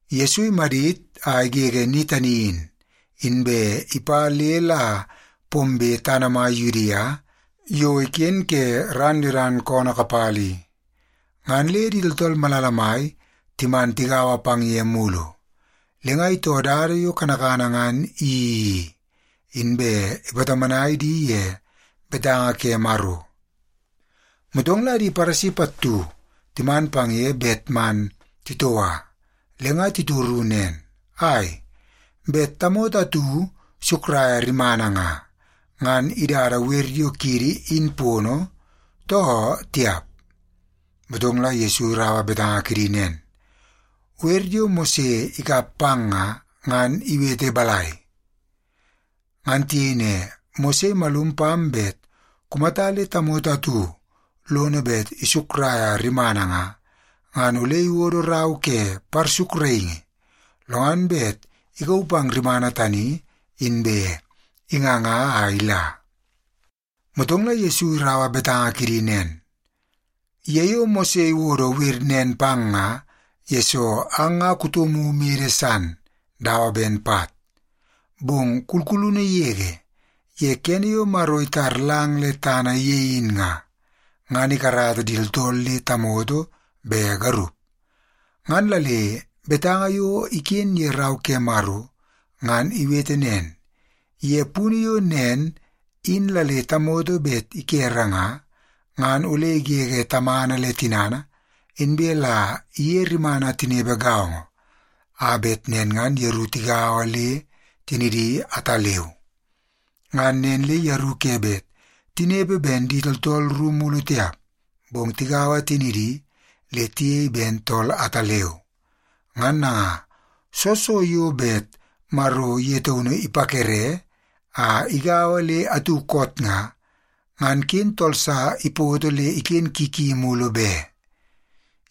Yesu imadit a igege ni tani in, inbe ipa le la pombe tana mai Yudia yo iken ke ran Yodan koonoo kapala i. Ngan le di tooltool malala mai timan tigaua pang ye mulu. Le nga itoo dada yo kanakana ngan iyeii i, inbe ipatomonai di ye betanga ke Maro. Motong la di Paresi pattu timan pang ye bet man titoua. Le nga titoru nen, “Ai, bet tamoto atu isukraia rimana nga, ngan idada wer yo kiidi in pono, too tiap?” Motong la Yesu iraua betanga kidi nen, “Wer yo Mose ikap pang nga, ngan iwete balai?” Ngan tiyei ne, “Mose imalum pam bet kumata le tamoto atu lono bet isukraia rimana nga, ngan ole iwodo rau ke parsukraingi, lo ngan bet ikauu pang rimana tani, inbe inganga a ila.” Motong la Yesu iraua betanga kidi nen, “Ye yo Mose iwodo wer nen pang nga, yesoo ang nga kutomu mede san dawa ben pat. Bong kulkulunu yege, ye kene yo Maro itar lang le tana ye in nga, ngan ‘ikarata di tooltool le tamoto be garup.’ Ngan la le betanga yo iken ye Rau ke Maro ngan iwete nen, ‘Ye punu yo nen in la le tamoto bet ikere nga, ngan ole igege tamana le tinana, inbe la iye rimana tinepe gaongo, a bet nen ngan yeru tigaua le tinidi ataleu.’ Ngan nen le yeru ke bet tinepe ben di tooltool ru mulu tiap, bong tigaua tinidi le tiyei ben tool ataleu. Ngan nanga, soo so yo bet Maro ye taunu ipakere a igaua le atu koot nga, ngan ken tool sa ipoto le iken ki ki mulu be.”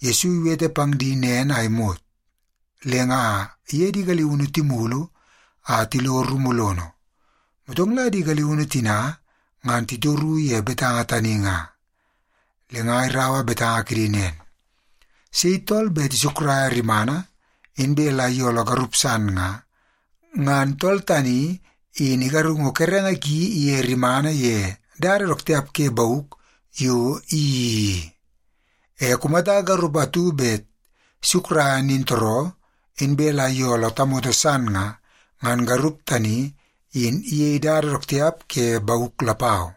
Yesu iwete pang di nen a imot, le nga iye di galiunu timulu a tilo rumu lono. Motong la di galiunu tina ngan titoru ye betanga tani nga. Le nga iraua betanga kidi nen, “Sei tool bet isukraia rimana, inbe la iyooloo garup san nga, ngan tool tani in igarungu kerenge ki iye rimana ye dada dook tiap ke bauk yo iyeii i. E kumata garup atu bet isukraia nintooroo, inbe la iyooloo tamoto san nga, ngan garup tani in iyei dada dook tiap ke bauk lapau.”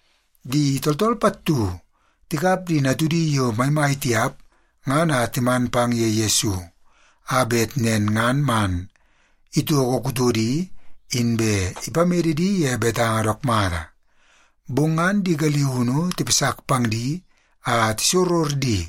Di tooltool pattu tikap di natudi yo maimai tiap ngan a timan pang ye Yesu, a bet nen ngan man itoko kutodi inbe ipamede di ye betanga dook mata. Bong ngan di galiunu tipasak pang di a tisoror di.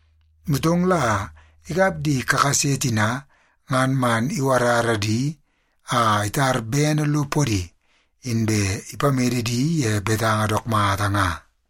Motong la ikap di kakase tina ngan man iwarara di a itar bene lo podi, inbe ipamede di ye betanga dook mata nga.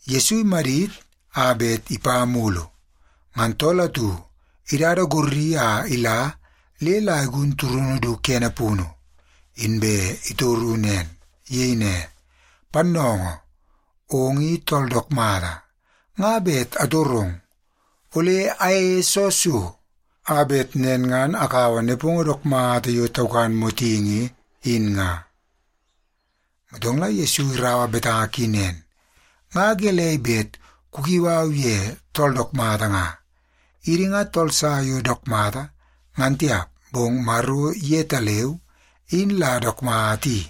Yesu imadit a bet ipa mulu, ngan tool atu idada gorri a ila le la igun turunu du kene punu, inbe itoro nen. Iyei ne, “Pannoongoo, ong i tool dook mata. Nga bet atorong, ole ayeie soo so, a bet nen ngan akaua nepongo dook mata yo taukan motingi in nga?” Motong la Yesu iraua betanga ki nen, “Nga gelei bet kukiu au ye tool dook mata nga? Idi nga tool sa yo dook mata, ngan tiap, bong Maro yetaleu in la dook mata i.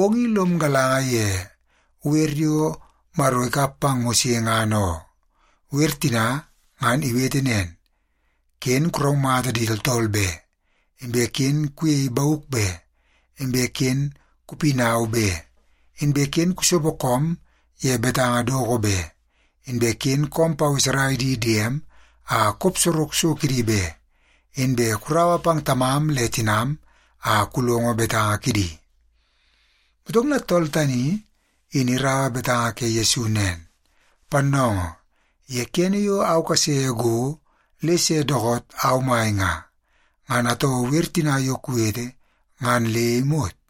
Ong i lom galanga ye wer yo Maro ikap pang Mose ngan oo. Wer tina ngan iwete nen: ‘Ken kuraumata di tooltool be, inbe ken kuyei bauk be, inbe ken kupinau be, inbe ken kusopo koom ye betanga doko be, inbe ken koom paweserai di diem a kop sorok so kidi be, inbe kuraua pang tamam le tinam a kulongo betanga kidi.’” Motong la tool tani in iraua betanga ke Yesu nen, “Pannoongoo, ye kene yo au kase go le se dookoot au mai nga, ngan atoo wer tina yo kuwete ngan le imot.”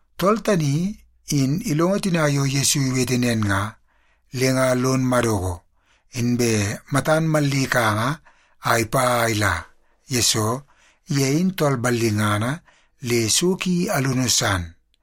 Tool tani in ilongo tina yo Yesu iwete nen nga, le nga lon madoko, inbe matan mallikanga a ipa a ila, yesoo ye in tool ballingana le so ki alunu san.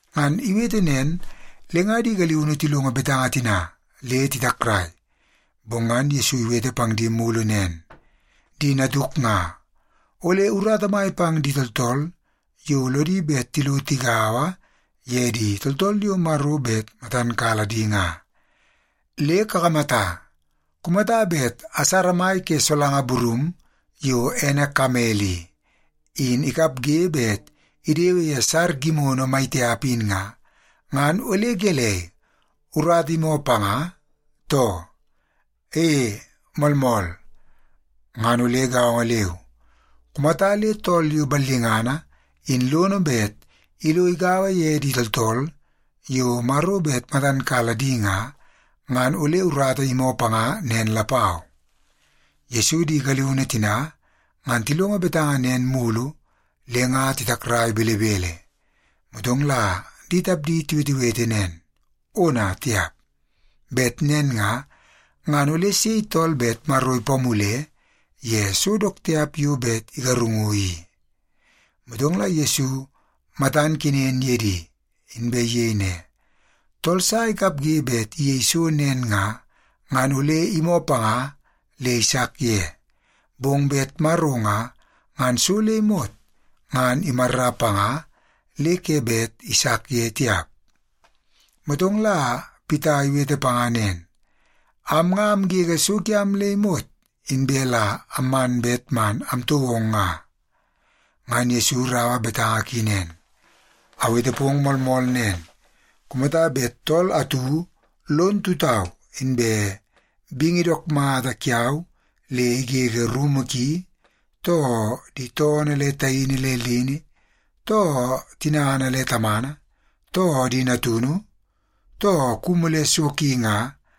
Ngan iwete nen le nga di galiunu tilongo betanga tina le titakrai. Bong ngan Yesu iwete pang di mulu nen, “Di natuk nga, ole urata mai pang di tooltool yo lodi bet tilo tigaua ye di tooltool yo Maro bet matan kala di nga. Le kakamata, kumata bet asara mai ke solanga burum yo ene kamel i, in ikapge bet idewe ye sar gimono maitiap in nga, ngan ole gelei, urata imoo panga, too? E, moolmool! Ngan ole gaongo leu, kumata le tool yo ballingana in lono bet ilo igaua ye di tooltool yo Maro bet matan kala di nga, ngan ole urata imoo panga nen lapau.” Yesu di galiunu tina ngan tilongo betanga nen mulu le nga titakrai belebele. Motong la di tapdi tiwetewete nen, “Ona tiap! Bet nen nga, ngan ole sei tool bet Maro ipamule ye so dook tiap yo bet igarungu i?” Motong la Yesu matan kenen ye di, inbe iyei ne, “Tool sa ikapge bet iyei so nen nga, ngan ole imoo panga le isak ye. Bong bet Maro nga, ngan so le imot ngan imarra panga le ke bet isak ye tiap.” Motong la Pita iwete panga nen, “Am nga amgege so kiam le imot, inbe la amman bet man amtoo ong nga.” Ngan Yesu iraua betanga ki nen, “Awete pong moolmool nen. Kumata bet tool atu lon tutau inbe bingi dook mata kiau le igege rumu ki, too di toonoo le taini le lini, too tinana le tamana, too di natunu, too kumu le so ki nga,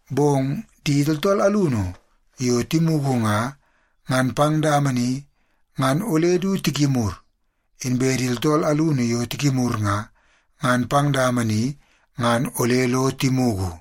Bong di tooltool alunu yo timugu nga, ngan pang dama ni ngan ole du tikimur. Inbe di tooltool alunu yo tikimur nga, ngan pang dama ni ngan ole lo timugu.”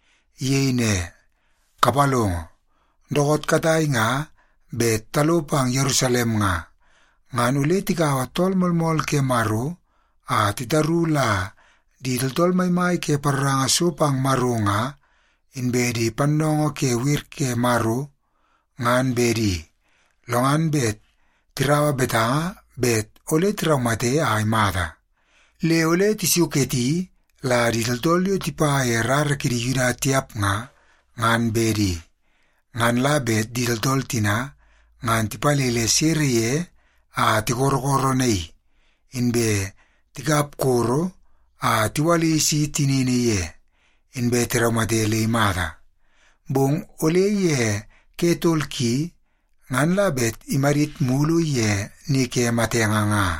Iyei ne, “Kapalongo, dookoot katai nga bet talo pang Yerusalem nga, ngan ole tikaua Tool Moolmool ke Maro a titaru la di tooltool maimai ke paroranga so pang Maro nga, inbe di pannoongoo ke wer ke Maro, ngan bedi. Lo ngan bet tiraua betanga bet ole tiraumate a imata. Le ole tisuketi la di tooltool yo tipa ye di rara kidi Yuda tiap nga, ngan bedi. Ngan la bet di tooltool tina ngan tipalele sere ye a tikorokoronaii, inbe tikap koro a tiwalisi tinini ye, inbe tiraumate le imata. Bong ole ye ke tol ki, ngan la bet imadit mulu ye ni ke matenge nga.”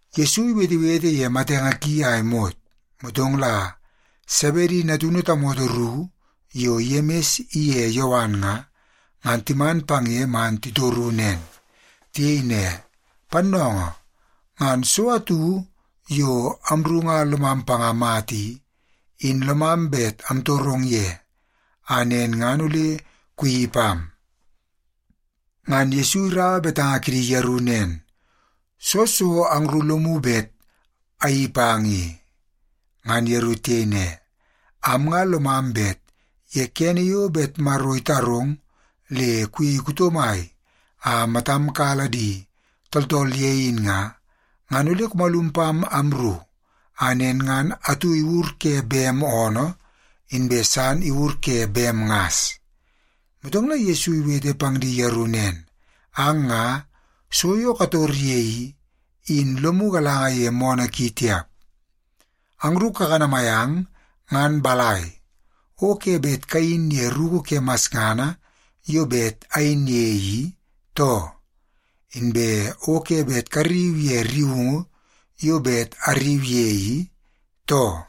Yesu iwetewete ye matenge ki a imot, motong la Sebedi natunu tamoto ru yo Yemis iye Yowan nga, ngan timan pang ye man titoru nen. Tiyei ne, “Pannoongoo, ngan so atu yo amru nga lomam panga mata i, in lomam bet amtorong ye, a nen ngan ole kuyeii pam.” Ngan Yesu iraua betanga kidi yeru nen, “Soo so angru lomu bet ayeii pang i?” Ngan yeru tiyei ne, “Am nga lomam bet ye kene yo bet Maro itarong le kuyei kuto mai a matam kala di tooltool ye in nga, ngan ole kumalum pam amru, a nen ngan atu iwur ke bem oonoo, inbe san iwur ke bem ngas.” Motong la Yesu iwete pang di yeru nen, “Ang nga, so yo kator ye i, in lomu galanga ye moonoo ki tiap. Angru kakanamai ang ngan balai, o ke bet kayin ye ruku ke masngana yo bet ayin ye i, too? Inbe o ke bet karriu ye rriungu yo bet arriu ye i, too?”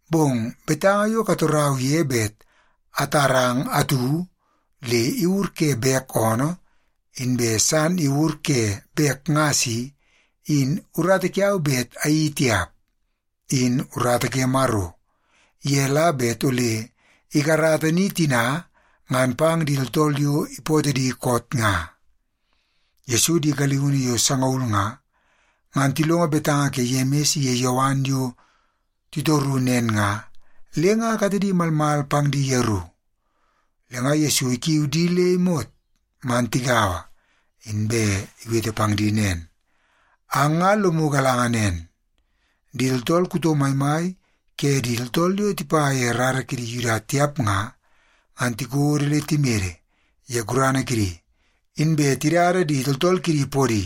Bong betanga yo katorau ye bet atarang atu le iwur ke bek oonoo, inbe san iwur ke bek ngas i, in urata kiau bet ayeii tiap. In urata ke Maro, ye la bet ole ikarata ni tina ngan pang di tooltool yo ipootoo di koot nga.” Yesu di galiunu yo sangaul nga, ngan tilongo betanga ke Yemis iye Yowan yo titoru nen nga, le nga katedi malmal pang di yeru. Le nga Yesu ikiu di le imot man tigaua, inbe iwete pang di nen, “Ang nga lomu galanga nen, di tooltool kuto maimai ke di tooltool yo tipa ye di rara kidi Yuda tiap nga, ngan tikodo le timede ye gurana kidi, inbe tidada di tooltool kidi podi.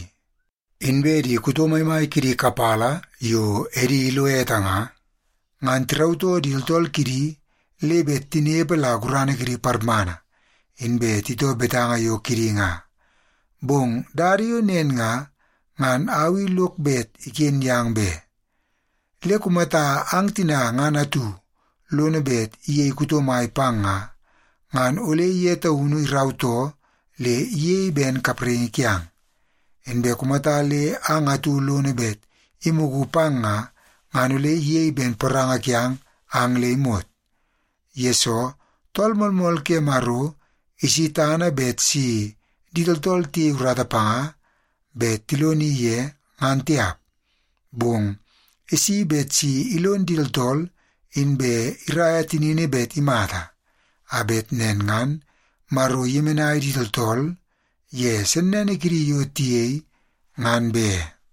Inbe di kuto maimai kidi kapala yo edi ilo ete nga, ngan tirautoo di tooltool kidi le bet tinepe la gurana kidi parmana, inbe titoo betanga yo kidi nga. Bong dada yo nen nga, ngan au i lok bet iken yang be. Le kumata ang tina ngan atu lono bet iyei kuto mai pang nga, ngan ole ye taunu irautoo le iyei ben kapraingi kiang. Inbe kumata le ang atu lono bet imugu pang nga, ngan ole iyei ben poranga kiang ang le imot. Yesoo, Tool Moolmool ke Maro isi tana bet si di tooltool tiyei urata panga bet tiloni ye, ngan tiap. Bong isi bet si ilon di tooltool inbe iraia tinini bet imata, a bet nen ngan Maro iyemenai di tooltool ye sennene kidi yo tiyei, ngan be.”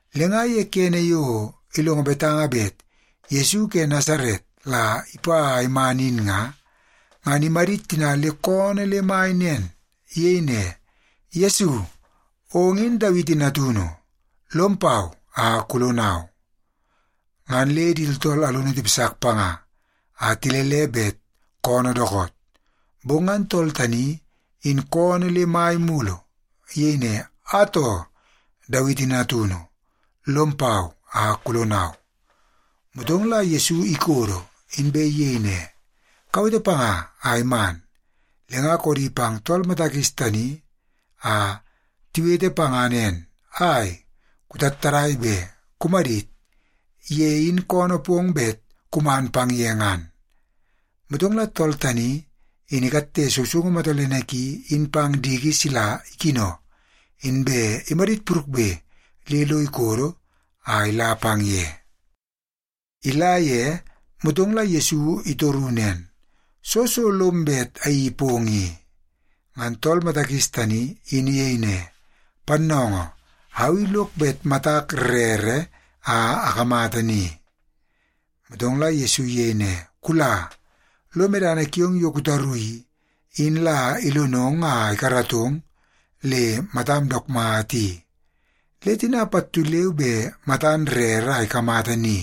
Le nga ye kene yo ilongo betanga bet Yesu ke Nasaret la ipa a iman in nga, ngan imadit tina le koonoo le mai nen. Iyei ne, “Yesu, ong in Dawiti natunu. Lom pau a kulonau!” Ngan le di tooltool alunu tipasak panga a tilele bet koonoo dookoot. Bong ngan tool tani in koonoo le mai mulu. Iyei ne, “Atoo, Dawiti Natunu, lom pau a kulonau!” Motong la Yesu ikodo, inbe iyei ne, “Kawete panga a iman.” Le nga koodi pang tool mata kis tani a tiwete panga nen, “Ai, kutattadai be! Kumadit. Ye in koonoo pong bet kuman pang ye ngan.” Motong la tool tani in ikatte sousoungu matolene ki in pang diki sila ikino, inbe imadit purukbe le lo ikodo a ila pang ye. Ila ye, motong la Yesu itoru nen, “Soo so lom bet ayeii pong i?” Ngan tool mata kis tani in iyei ne, “Pannoongoo, au i lok bet matak rere a akamata ni.” Motong la Yesu iyei ne, “Kula, lo medana kiong yo kutaru i, in la ilonong a ikaratong le matam dook mata i.” Le tina pattu leu be matan rere a ikamata ni,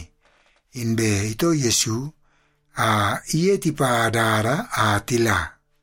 inbe itoo Yesu a iye tipa dada a tila.